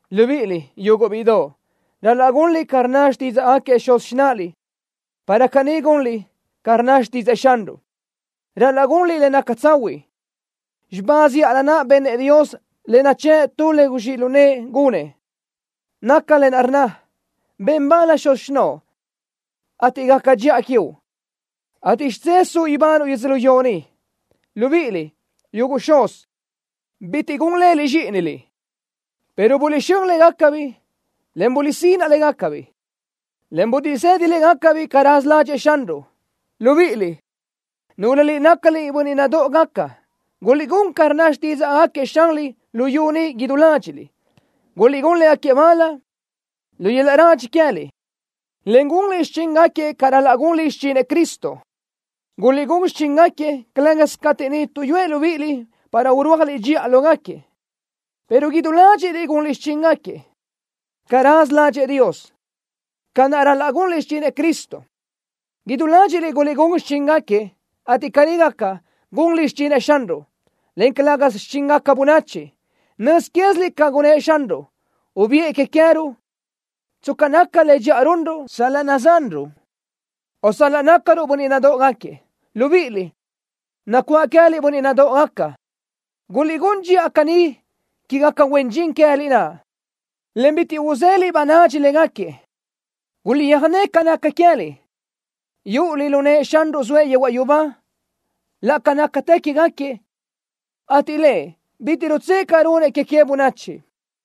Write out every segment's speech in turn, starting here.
Libíʼiliʼ, yuguʼ bíʼidoʼ, ral-laʼ gunliʼ ca rnna xtídzaʼgaquiëʼ xuz xináʼaliʼ para caní gunliʼ ca rnna xtídzëʼë Xanruʼ. Ral-laʼ gunliʼ le naca tsahuiʼ. Xibá zíʼalö naʼ benëʼ Dios le nachë́ʼ tu le guzxíʼ lu nëʼë gunëʼ, naca lë naʼ rnna: “Ben bal xuz xinóʼo, ateʼ gaca dxiʼa quiuʼ, ateʼ xidzé suʼ ibanuʼ yödzölió ni.” Libíʼiliʼ, yuguʼ xuz, bitiʼ gun leliʼ zxíʼiniliʼ, pero buliʼxö́n légacabiʼ, en guliʼsínaʼ légacabiʼ, en buliʼsëdi légacabiʼ ca raza ládxëʼë Xanruʼ. Libíʼiliʼ, núlöliʼ nácaliʼ bönniʼ nadóʼogaca, guliʼgún ca rnna xtídzaʼgaquiëʼ xanliʼ luyú ni idú ládxiʼliʼ, gunliʼ légaquiëʼ bal lu yöl-laʼ radxi queë́liʼ, en gunliʼ xichíngaquiëʼ ca ral-laʼ gunliʼ xichinëʼ Cristo. Guliʼgún xichíngaquiëʼ, calë́gasö cateʼ niʼ tuʼyúëʼ libíʼiliʼ para urúajliʼ dxiʼa lógaquiëʼ, pero idú ládxiʼliʼ guliʼgún xichíngaquiëʼ ca raza ládxëʼë Dios, ca naʼ ral-laʼ gunliʼ xichinëʼ Cristo. Idú ládxiʼliʼ guliʼgún xichíngaquiëʼ, ateʼ caní gaca, gunliʼ xichinëʼ Xanruʼ, en calë́gasö xichíngaca bönachi. Nöz quéziliʼ ca gunëʼ Xanruʼ. Ubiʼë que queë́ruʼ tsca naca le dxiʼa runruʼ sal-laʼ nadzanruʼ, o sal-laʼ nácaruʼ bönniʼ nadóʼogaquiëʼ. Libíʼiliʼ, nacuáʼ queë́liʼ bönniʼ nadóʼogaca, guliʼgún dxiʼa caní quégaca huen dxin queë́liʼ naʼ, en bitiʼ uzéliʼ ba nadx légaquiëʼ. Guliʼtsöjné ca naca queë́liʼ, yúʼuliʼ lu nëʼë Xanruʼ zoëʼ yehuaʼ yubá laʼ ca nácatë quégaquiëʼ, ateʼ Lëʼ bitiʼ rutsë́ʼë ca runëʼ que que bönachi.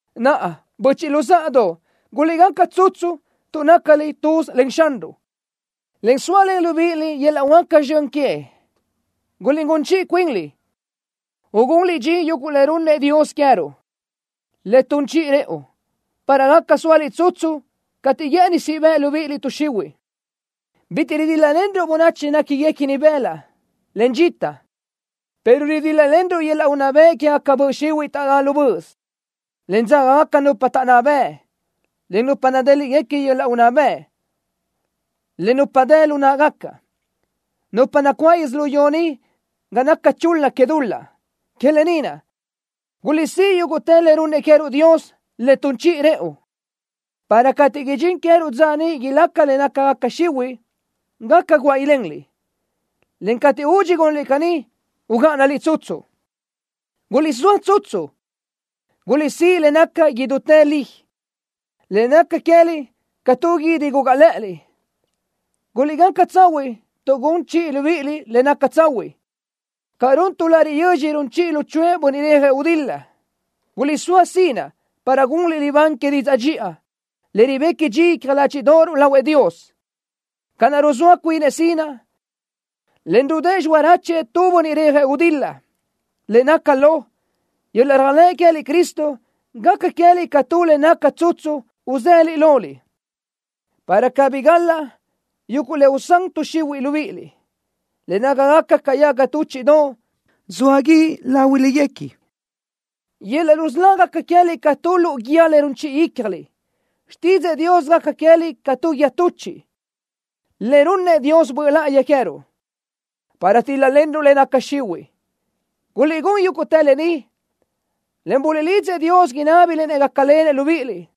Naʼa, böchiʼ luzáʼadoʼ, guliʼgaca tsutsu tuʼ nácaliʼ tuz len Xanruʼ, en zóalen libíʼiliʼ yöl-laʼ huáca zxön queëʼ. Guliʼgún chiʼi cuinliʼ, ugunliʼ dxin yuguʼ le runnëʼ Dios queë́ruʼ, le tun chiʼi rëʼu, para gaca sóaliʼ tsutsu cateʼ guë́ʼëni siʼ bëʼ tuʼ xihuiʼ libíʼiliʼ. Bitiʼ ridíl-lalenruʼ bönachi néquiguequini bëlaʼ, en dxita, pero ridíl-lalenruʼ yöl-laʼ unná bëʼ quégaca böʼ xihuiʼ taʼdá lu böʼös, en dzágagaca nupa taʼnná bëʼ, en nupa nadéliʼgaca yöl-laʼ unná bëʼ, en nupa dë lu náʼagaca, nupa nacuáʼ yödzölió ni ga naca chul-la que dul-laʼ. Que lë ni naʼ: Guliʼsíʼ yúguʼtë le runnëʼ queë́ruʼ Dios le tun chiʼi rëʼu, para cateʼ idxín queë́ruʼ dza niʼ ilaca le nácagaca xihuiʼ, gaca guáʼ ilenliʼ, en cateʼ údxi gunliʼ caní, ugáʼanaliʼ tsutsu. Guliʼsóa tsutsu. Guliʼsíʼ le naca idútë li, le gaca queë́liʼ ca tu guídi gugaʼ lë́ʼëliʼ. Guliʼgaca tsahuiʼ tuʼ gun chiʼi libíʼiliʼ le naca tsahuiʼ ca run tu lariʼ yödx run chiʼi luchuʼë bönniʼ rejëʼ gudil-la. Guliʼsóa sinaʼ para gunliʼ libán que didzaʼ dxiʼa le ribequi dxi icja ládxiʼdoʼoruʼ lahuëʼ Dios, ca naʼ ruzóa cuinëʼ sinaʼ, en ridë́ʼë xiráchuëʼ tu bönniʼ rejëʼ gudil-la. Le naca lo, yöl-laʼ réajlëʼ queë́liʼ Cristo gaca queë́liʼ ca tu le naca tsutsu uzëliʼ loliʼ, para cabí gál-laʼ yuguʼ le usán tuʼ xihuiʼ libíʼiliʼ, le nácagaca ca yaga túchiʼdoʼ zoa guíʼ láhuilöguequi. Yöl-laʼ rusölá gaca queë́liʼ ca tu luʼu guíë le gun chiʼi ícjaliʼ. Xtídzëʼë Dios gaca queë́liʼ ca tu guíë tuchiʼ le runnëʼ Dios Böʼ Láʼayi queë́ruʼ, para utíl-lalenruʼ le naca xihuiʼ. Guliʼgún yúguʼtë lë ni, en buliʼlidzëʼ Dios inábiliʼ-nëʼ gácalenëʼ libíʼiliʼ.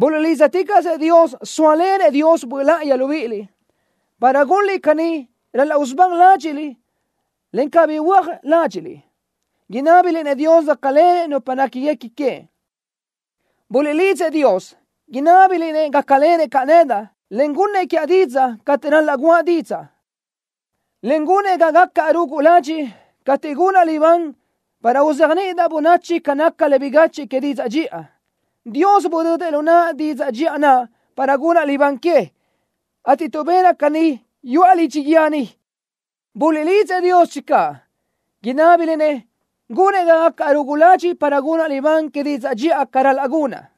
Buliʼlídzaticaʼsëʼ Dios zóalenëʼ Dios Böʼ Láʼayi libíʼiliʼ. Para gunliʼ caní ral-laʼ usubán ládxiʼliʼ en cabí huö́aj ládxiʼliʼ, inábiliʼ-nëʼ Dios gácalenëʼ nupa néquiguequi queëʼ. Buliʼlidzëʼ Dios, inábiliʼ-nëʼ gácalenëʼ caʼ nedaʼ, en gunnëʼ quiaʼ didzaʼ cateʼ ral-laʼ guʼa didzaʼ, en gunëʼ ga gacaʼ rugu ladxiʼ cateʼ gunaʼ libán para uzéajniʼidaʼ bönachi ca naca le bigachiʼ que didzaʼ dxiʼa. Dios budödëʼ lu naʼa didzaʼ dxiʼa naʼ para gunaʼ libán que, ateʼ tuʼ benaʼ caní yuʼa lidxi guíë ni. Buliʼlidzëʼ Dios channö, inábiliʼ-nëʼ gunëʼ ga gacaʼ rugu ladxiʼ para gunaʼ libán que didzaʼ dxiʼa ca ral-laʼ gunaʼ.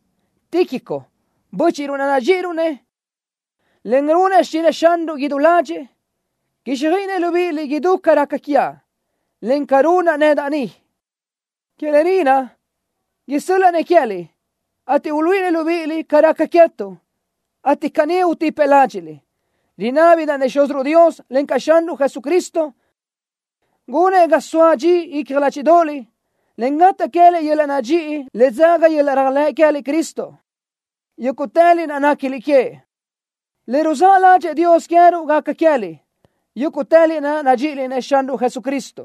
Tíquico, bö́chiʼruʼ naʼ nadxíʼiruʼ-nëʼ, en runëʼ xichinëʼ Xanruʼ idú ládxëʼë, quíxjöiʼinëʼ libíʼiliʼ idú ca raca quiaʼ, en ca runaʼ nedaʼ ni. Que lë ni naʼ, isö́l-laʼa-nëʼ queë́liʼ, ateʼ uluíʼinëʼ libíʼiliʼ ca raca queë́tuʼ, ateʼ caní utipëʼ ládxiʼliʼ. Rinábidaʼ-nëʼ Xúziruʼ Dios, encaʼ Xanruʼ Jesucristo gunëʼ ga soa dxi icja ládxiʼdoʼoliʼ, en gataʼ queë́liʼ yöl-laʼ nadxíʼi le dzaga yöl-laʼ réajlëʼ queë́liʼ Cristo, yúguʼtëliʼ naʼ néquiliʼ queëʼ. Le ruzáʼ ládxëʼë Dios queë́ruʼ gaca queë́liʼ, yúguʼtëliʼ naʼ nadxíʼiliʼ-nëʼ Xanruʼ Jesucristo,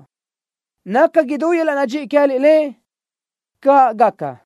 naca idú yöl-laʼ nadxíʼi queë́liʼ Lëʼ. ¡Caʼ gaca!